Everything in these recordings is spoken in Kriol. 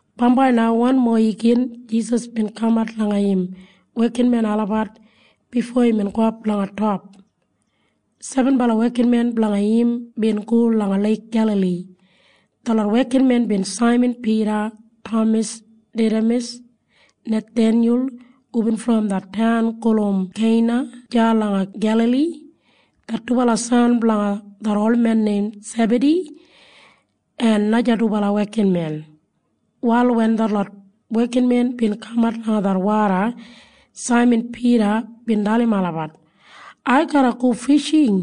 Bambai na wanmo igin Jisas bin kamat langa im wekinmen olabat bifo imbin gowap langa top. Sebenbala wekinmen blanga im bin go langa Leik Gelali. Detlot wekinmen bin Saiman Pida, Tamas Didamas, Nathenyul hubin brom det taun gulum Keina deya langa Gelali, det dubala san blanga det olmen neim Sebadi, en naja dubala wekinmen. Wal wen detlot wekinmen bin kamat langa det woda, Saiman Pida bin dalim olabat, “Ai garra go fishing.”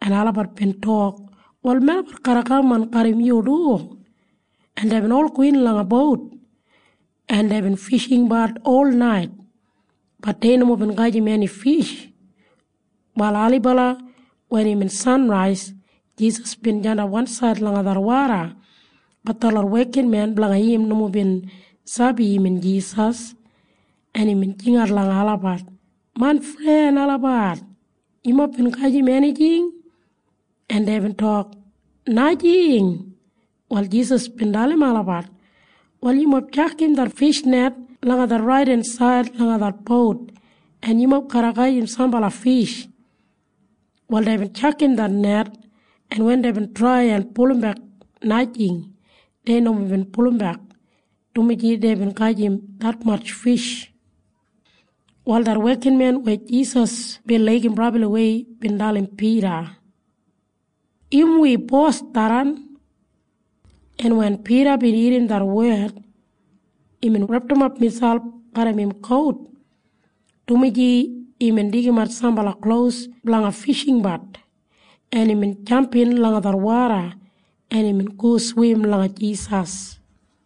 En olabat bin tok, “Wal melabat garra kaman garram yu du.” En deibin ol gowin langa bout, en deibin fishingbat olnait. Bat dei nomo bin gajim eni fish. Wal ailibala wen imbin sanrais, Jisas bin jandap wansaid langa det woda. Bat detlot wekinmen blanga im nomo bin sabi imbin Jisas. En imbin jingat langa olabat, “Main fren olabat, yumob bin gajim enijing?” En deibin tok, “Najing.” Wal Jisas bin dalim olabat, “Wal yumob tjakam det fishnet langa det raidensaid langa det bout, en yumob garra gajim sambala fish.” Wal deibin tjakam det net, en wen deibin trai blanga pulumbek, najing, dumaji deibin gajim detmatj fish. Wal det wekinmen weya Jisas bin laigim brabliwei bin dalim Pida, “Im wi Bos tharran!” En wen Pida bin irrim det wed, imbin repdimap miselp garram im kout, dumaji imbin deigimat sambala klos blanga fishingbat, en imbin jampin langa det woda, en imbin go swim langa Jisas.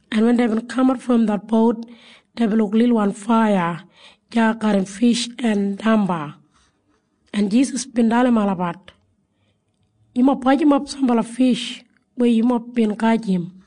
en wen deibin kamat brom det bout, deibin luk lilwan faiya deya garram fish en damba, en Jisas bin dalim olabat, “Yumob bajimap sambala fish weya yumob bin gajim.”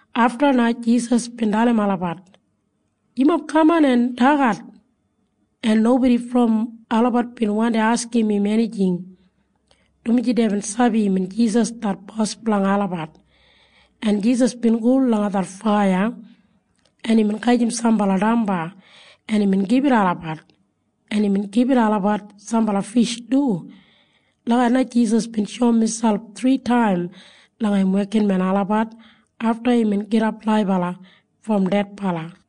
Afta na Jisas bin dalim olabat, “Yumob kaman en dagat.” En nobodi brom olabat bin wandi askim im enijing, dumaji deibin sabi imbin Jisas det Bos blanga olabat. En Jisas bin go langa det faiya, en imbin gajim sambala damba, en imbin gibit olabat, en imbin gibit olabat sambala fish du. Lagijat na Jisas bin shoum miselp thritaim langa im wekinmen olabat afta imbin gidap laibala brom dedbala.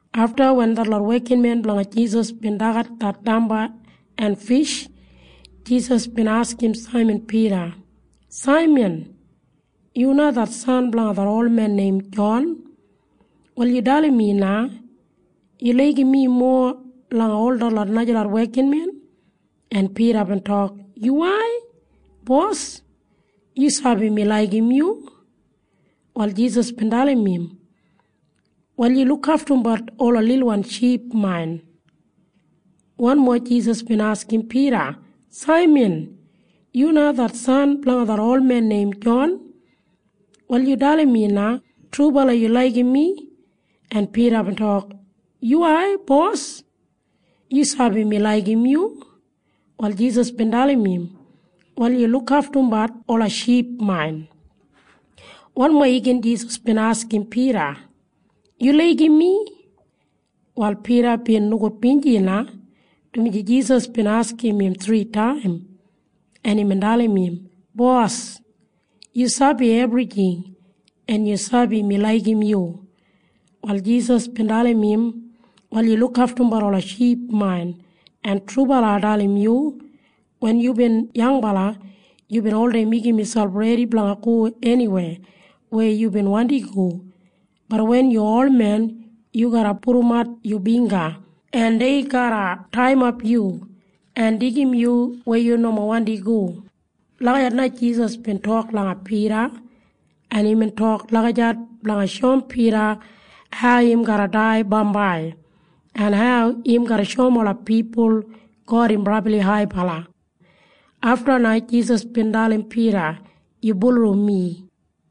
Afta wen detlot wekinmen blanga Jisas bin dagat det damba en fish, Jisas bin askim Saiman Pida, “Saiman, yu na det san blanga det olmen neim Jon. Wal yu dalim mi na. Yu laigim mi mowa langa ol detlot najalot wekinmen?” En Pida bin tok, “Yuwai, Bos. Yu sabi mi laigim yu.” Wal Jisas bin dalim im, “Wal yu lukaftumbat ola lilwan ship main.” Wanmo Jisas bin askim Pida, “Saiman, yu na det san blanga det olmen neim Jon. Wal yu dalim mi na. Trubala yu laigim mi?” En Pida bin tok, “Yuwai, Bos. Yu sabi mi laigim yu.” Wal Jisas bin dalim im, “Wal yu lukaftumbat ola ship main.” Wanmo igin Jisas bin askim Pida, “Yu laigim mi?” Wal Pida bin nogudbinji na, dumaji Jisas bin askim im thritaim, en imbin dalim im, “Bos, yu sabi ebrijing. En yu sabi mi laigim yu.” Wal Jisas bin dalim im, “Wal yu lukaftumbat ola ship main. En trubala ai dalim yu. Wen yubin yangbala, yubin oldei meigim miselp redi blanga go eniweya weya yubin wandi go. Bat wen yu olmen, yu garra pudumat yu bingga, en dei garra taiyimap yu en deigim yu weya yu nomo wandi go.” Lagijat na Jisas bin tok langa Pida, en imbin tok lagijat blanga shoum Pida hau im garra dai bambai, en hau im garra shoum ola pipul God im brabli haibala. Afta na Jisas bin dalim Pida, “Yu bulurrum mi.”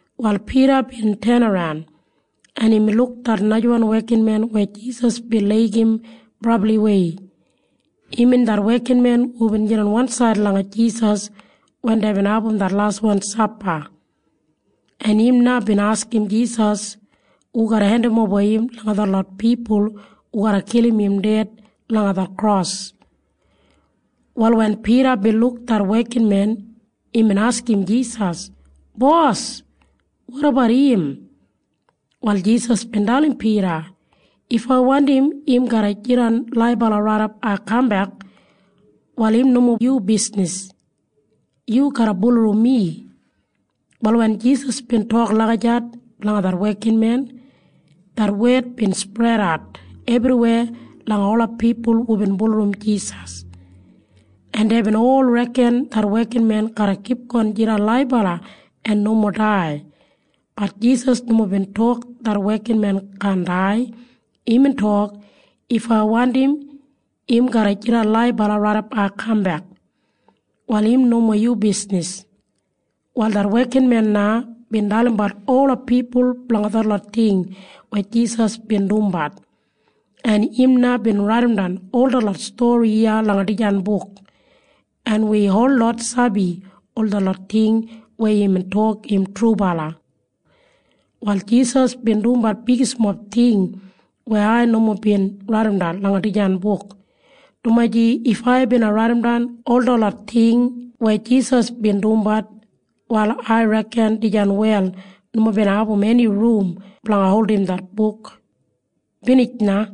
Wal Pida bin tenaran, en imbin luk det najawan wekinmen weya Jisas bin laigim brabliwei. Imbin det wekinmen hubin jidan wansaid langa Jisas wen deibin abum det laswan sapa, en im na bin askim Jisas hu garra hendimoba im langa detlot pipul hu garra kilim im ded langa det kros. Wal wen Pida bin luk det wekinmen, imbin askim Jisas, “Bos, wotabat im?” Wal Jisas bin dalim Pida, “If ai wandim im garra jidan laibala raidap ai kambek, wal im nomo yu bisnis. Yu garra bulurrum mi.” Wal wen Jisas bin tok lagijat blanga det wekinmen, det wed bin spredat ebriweya langa ola pipul hubin bulurrum Jisas, en deibin ol reken det wekinmen garra kipgon jidan laibala en nomo dai. Bat Jisas nomo bin tok det wekinmen kaan dai. Imbin tok, “If ai wandim im garra jidan laibala raidap ai kambek, wal im nomo yu bisnis.” Wal det wekinmen na bin dalimbat ola pipul blanga detlot ting weya Jisas bin dumbat, en im na bin raidimdan ol detlot stori iya langa dijan buk, en wi holot sabi ol detlot ting weya imbin tok im trubala. Wal Jisas bin dumbat bigismob ting weya ai nomo bin raidimdan langa dijan buk, dumaji if ai bina raidimdan ol detlot ting weya Jisas bin dumbat, wal ai reken dijan wel nomo bina abum eni rum blanga holdim det buk. Binij na.